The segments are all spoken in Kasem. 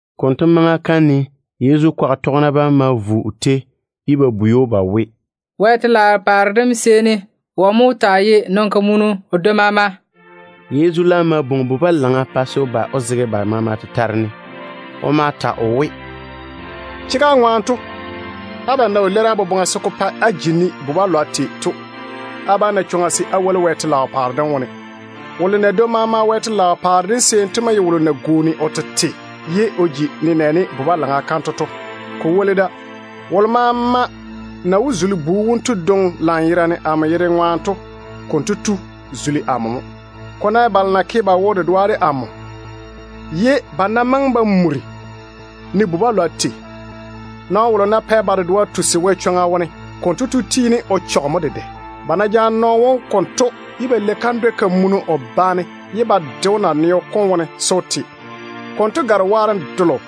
Konto maŋa kam ne Yezu kwaga tɔgena bam ma vo o tei, ye ba bwei‑o ba we, “Wɛ telaao paare dem seeni wɔ mo wó taa ye nɔn-kamunu o dwoi maama?” Yezu laam ma bwoŋi bu-balaŋa pa se o ba o zege ba maama tetare ne. O ma ta o we, “Chega ŋwaane to, abam ná wo leiri á boboŋa se ko pa á ji ne bu-balwa tei to, á bá na chwoŋa se á zo Wɛ telaao paare dem wo. Wolo na dwoi maama Wɛ telaao paare dem wone to mo ye wolo na gwooni o tete ye o ji nenɛɛne bu-balaŋa kanto to. Ko woli da, wolo maama na wó zuli bu wonto dwoŋi lanyerane amo yere ŋwaane to, konto tu zuli amo mo. Ko ná ye balo na ke ba wo-dedoa de amo, ye ba ná maŋe ba muri ne bu-balwa tei, nɔɔno wolo ná pɛ ba dedoa tusi Wɛ chwoŋa wone, konto tu tiini o chɔge mo dedɛ. Ba ná jaane nɔɔno wom konto ye ba lei kandwɛ-kamunu o ba ne ba daare ba de‑o naneo wone se o te, konto gare waarem delo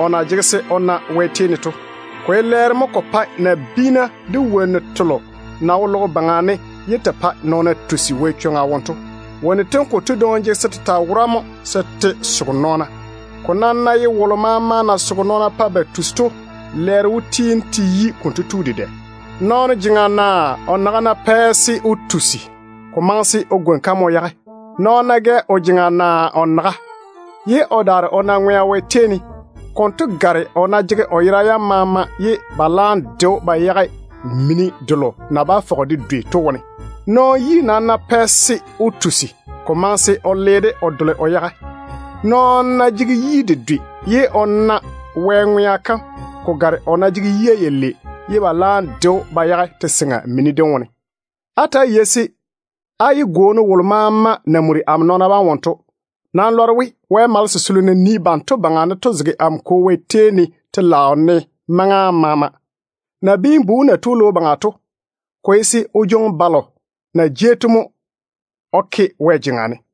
kotu na jege se o na Wɛ tei ne to. Ko ye lɛɛro mo ko pae nabiina de wonnu telo na wo logo baŋa ne ye te pae nɔɔna tusi Wɛ chwoŋa wone to. Wonnu tem konto dwoŋi jege se te taa wora se te soge nɔɔna. Wolo maama nam ná tɔge te baŋa o soge nɔɔna pa ba tusi, lɛɛro wó tiini te yi konto tu dedɛ. Nɔɔno jeŋa naa o naga ná pɛ se o tusi, ko maŋe se o gwoni-ka mo o yage. Nɔɔno ná gɛ o jeŋa naa o naga, ye o daare o na ŋwea Wɛ tei ne, konto gare o ná jege o yera yam maama ye ba laam de‑o ba yage mini delo na bá fɔge de dwei to wone. Nɔɔno yi nam ná pɛ se o tusi, ko maŋe se o le-de o dole o yage. Nɔɔno ná jege yi dedwe ye o na Wɛ ŋwea kam, ko gare o ná jege yia yalei ye ba laam de‑o ba yage te-seŋa mini dem wone. Ta‑á yei-na se á yé gwooni wolo maama na muri amo nɔɔna bam wone to. Nam lɔre we, Wɛ malese selo na nii banto baŋa ne to zege amo Kwo Wɛ tei ne telaao ne maŋa maama. [ Nabiin-bu wom na tu logo baŋa to, ko ye se o jwoŋi balo na jei to mo o ke Wɛ jeŋa ne.]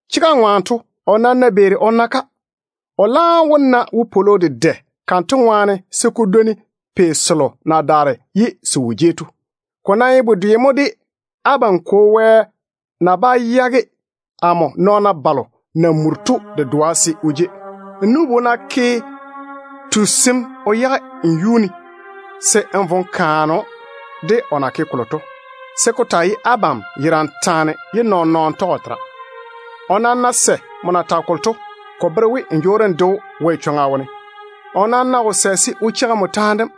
Chega ŋwaane to, o nam ná beeri o na-ka, o laam wó na wopwolo dedɛ kanto ŋwaane se ko dwoni pei selo na daare ye se wo jei to. Ko nam ye bedwe mo de abam Kwo Wɛ na bá yage amo nɔɔna balo na muri to dedoa se o jei. Nmo nu-bu ná ke lwarem o chɔge nmo wo, se n vo n kaane‑o de o na ke kolo to, se ko taa ye abam yerane taane ye nɔɔn-nɔɔno tɔge o tera. O nam ná sɛ nmo na tage kolo to, ko bere we n jwoori n de‑o Wɛ chwoŋa wone. O nam ná wo sɛ se o cheigi nmo taane dem,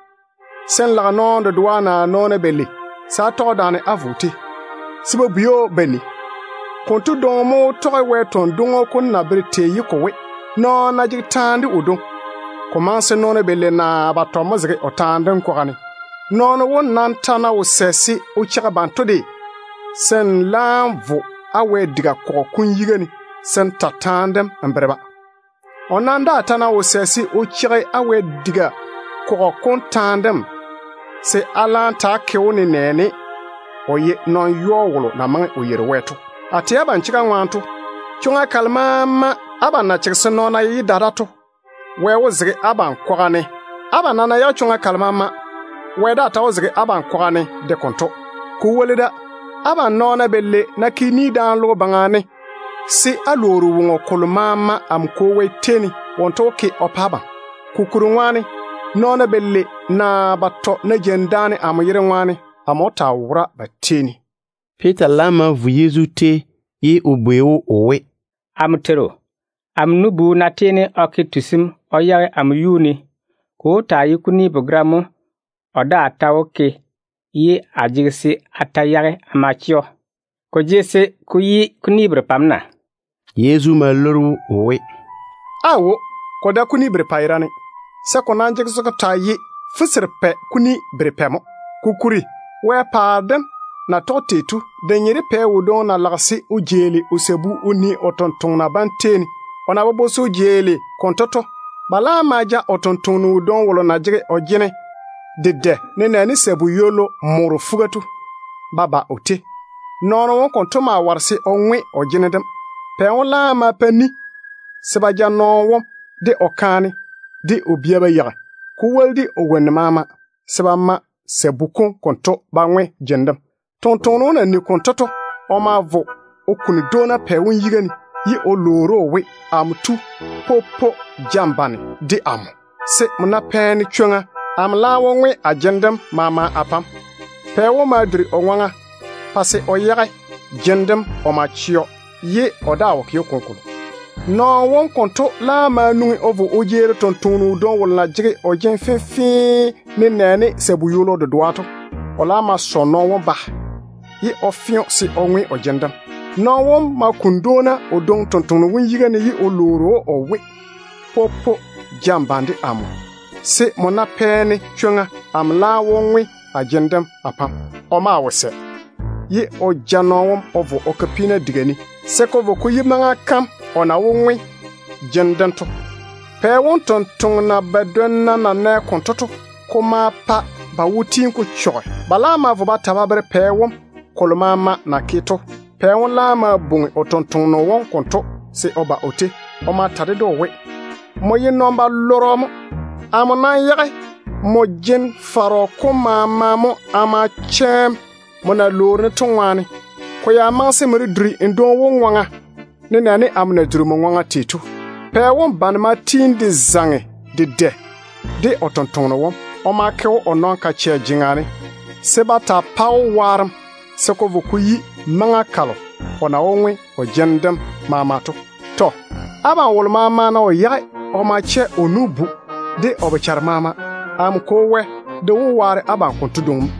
se n lage nɔɔno dedoa naa nɔɔna balei se á tɔge daane á vo o tei, se ba bwei‑o ba nii. Konto dwoŋi mo wó tɔge Wɛ tɔn-dwoŋo kom na bere tei to we, ‘Nɔɔno ná jege taane de o dwoŋi, ko maŋe se nɔɔna balei naa batɔ mo zege o taane dem kwaga ne.’ Nɔɔno wom nam ta ná wo sɛ se o cheigi banto de, se n laam vo n wɛ-diga kɔgɔ kom yiga ne n tole taane dem n bere-ba. O nam daa ta ná wo sɛ se o cheigi á wɛ-diga kɔgɔ kom taane dem, se á laam ta‑á ke‑o nenɛɛne o ye nɔn-yɔɔ wolo na maŋe o yeiri Wɛ to. A tɛ abam chega ŋwaane to, chwoŋa kalo maama abam na chege se nɔɔna yé da da to, Wɛ wó zege abam kwaga ne de konto. Abam nam ná yage chwoŋa kalo maama, Wɛ daa ta wó zege abam kwaga ne de konto. Ko woli da, abam nɔɔna balei ná ke ni daane logo baŋa ne se á lwoori woŋo kolo maama amo Kwo Wɛ tei ne, wonto wó ke o pa abam. Kokuri ŋwaane, nɔɔna balei naa batɔ ná jeini daane amo yere ŋwaane, amo wó taa wora ba tei ne.” Piita laam ma vo Yezu tei, ye o bwei‑o o we, “Amo Teiru, amo nu-bu ná yɔɔre o ke lwarem o chɔge amo wo, ko wó taa ye kuni begera mo o daa ta wó ke ye a jege se a yage a ma chɛ‑o? Ko maŋe se ko yi kuni berepɛ mo na?” Yezu ma leiri‑o o we, “Aawo, ko dae kuni berepɛ yerane, se ko nam jege se ko taa ye fuserepɛ kuni berepɛ mo. Kokuri Wɛ paare dem na ye tei to, de nye de pɛ wodwoŋi na lage se o jeeli o sabu o nii o tontoŋena bam tei ne. O na bobo se o jeeli konto to, ba laam ma ja o tontoŋeno wodwoŋi wolo na jege o jene dedɛ se ko maŋe de sabu ywollu morro morro to ba ba o tei. Nɔɔno wom konto maa ware o ŋwe o jene dem. Pɛ wom laam ma pa ni se ba ja nɔɔno wom, de o kaane, de o bia maama ba yeigi, ko woli de o wonnu maama, se ba ma sabu kom konto ba ŋwe jene dem. Tontoŋeno wom na nigi konto to, o ma vo o kuni dwoona pɛ wom yiga ne, ye o lwoori‑o o we, ‘Amo tu, popo ja n bane de amo, se nmo ná pɛ-ne chwoŋa, amo laam wó ŋwe a jene dem maama a pa‑m.’ Pɛ wom ma duri o ŋwaŋa pa se o yage jene dem o ma chɛ‑o, ye o daa wo ke‑o kolokolo. Nɔɔno wom konto laam ma nwoŋi o vo o jeeri tontoŋeno wodwoŋi wolo na jege o jene fenfee nenɛɛne sabu ywolo dedoa to. O ma sɔ nɔɔno wom ba, ye o fe‑o se o ŋwe o jene dem. Nɔɔno wom ma kuni dwoona o dwoŋi tontoŋeno wom yiga ne ye o lwoori‑o o we, ‘Popo ja n bane de amo, se nmo ná pɛ-ne chwoŋa, amo laam wó ŋwe a jene dem a pa‑m.’ O maa wo sɛ, ye o ja nɔɔno wom o vo o ke peena diga ne se ko vo ko yi maŋa kam o na wó ŋwe jene dem to. Pɛ wom tontoŋena badwonna na nɛ konto to, ko ma pa ba wo tiini ko chɔge. Ba ma vo ba ta ba bere pɛ wom kolo maama na ke to. Pɛ wom laam ma bwoŋi o tontoŋeno wom konto se o ba o tei. O ma ta ded‑o o we, ‘Nmo ye puseŋ-nyeno mo. Amo yage nmo jen-fɔrɔ kom maama mo a ma chɛ‑m, nmo na lwoori-ne to ŋwaane. Ko ya maŋe se nmo de duri n dwoŋi wom ŋwaŋa, nenɛɛne amo na duri nmo ŋwaŋa tei to.’ Pɛ wom bane ma tiini de zaŋe dedɛ de o tontoŋeno wom. O ma ke‑o o nɔn-kachɛ jeŋa ne se ba taa pa‑o waarem se ko taa vei maŋa kalo o na wó ŋwe o jene dem maama to. Tɔ. Abam wolo maama ná wo yage o ma chɛ o nu-bu de o bochare maama, amo Kwo Wɛ de wó waare abam konto dwoŋi mo.”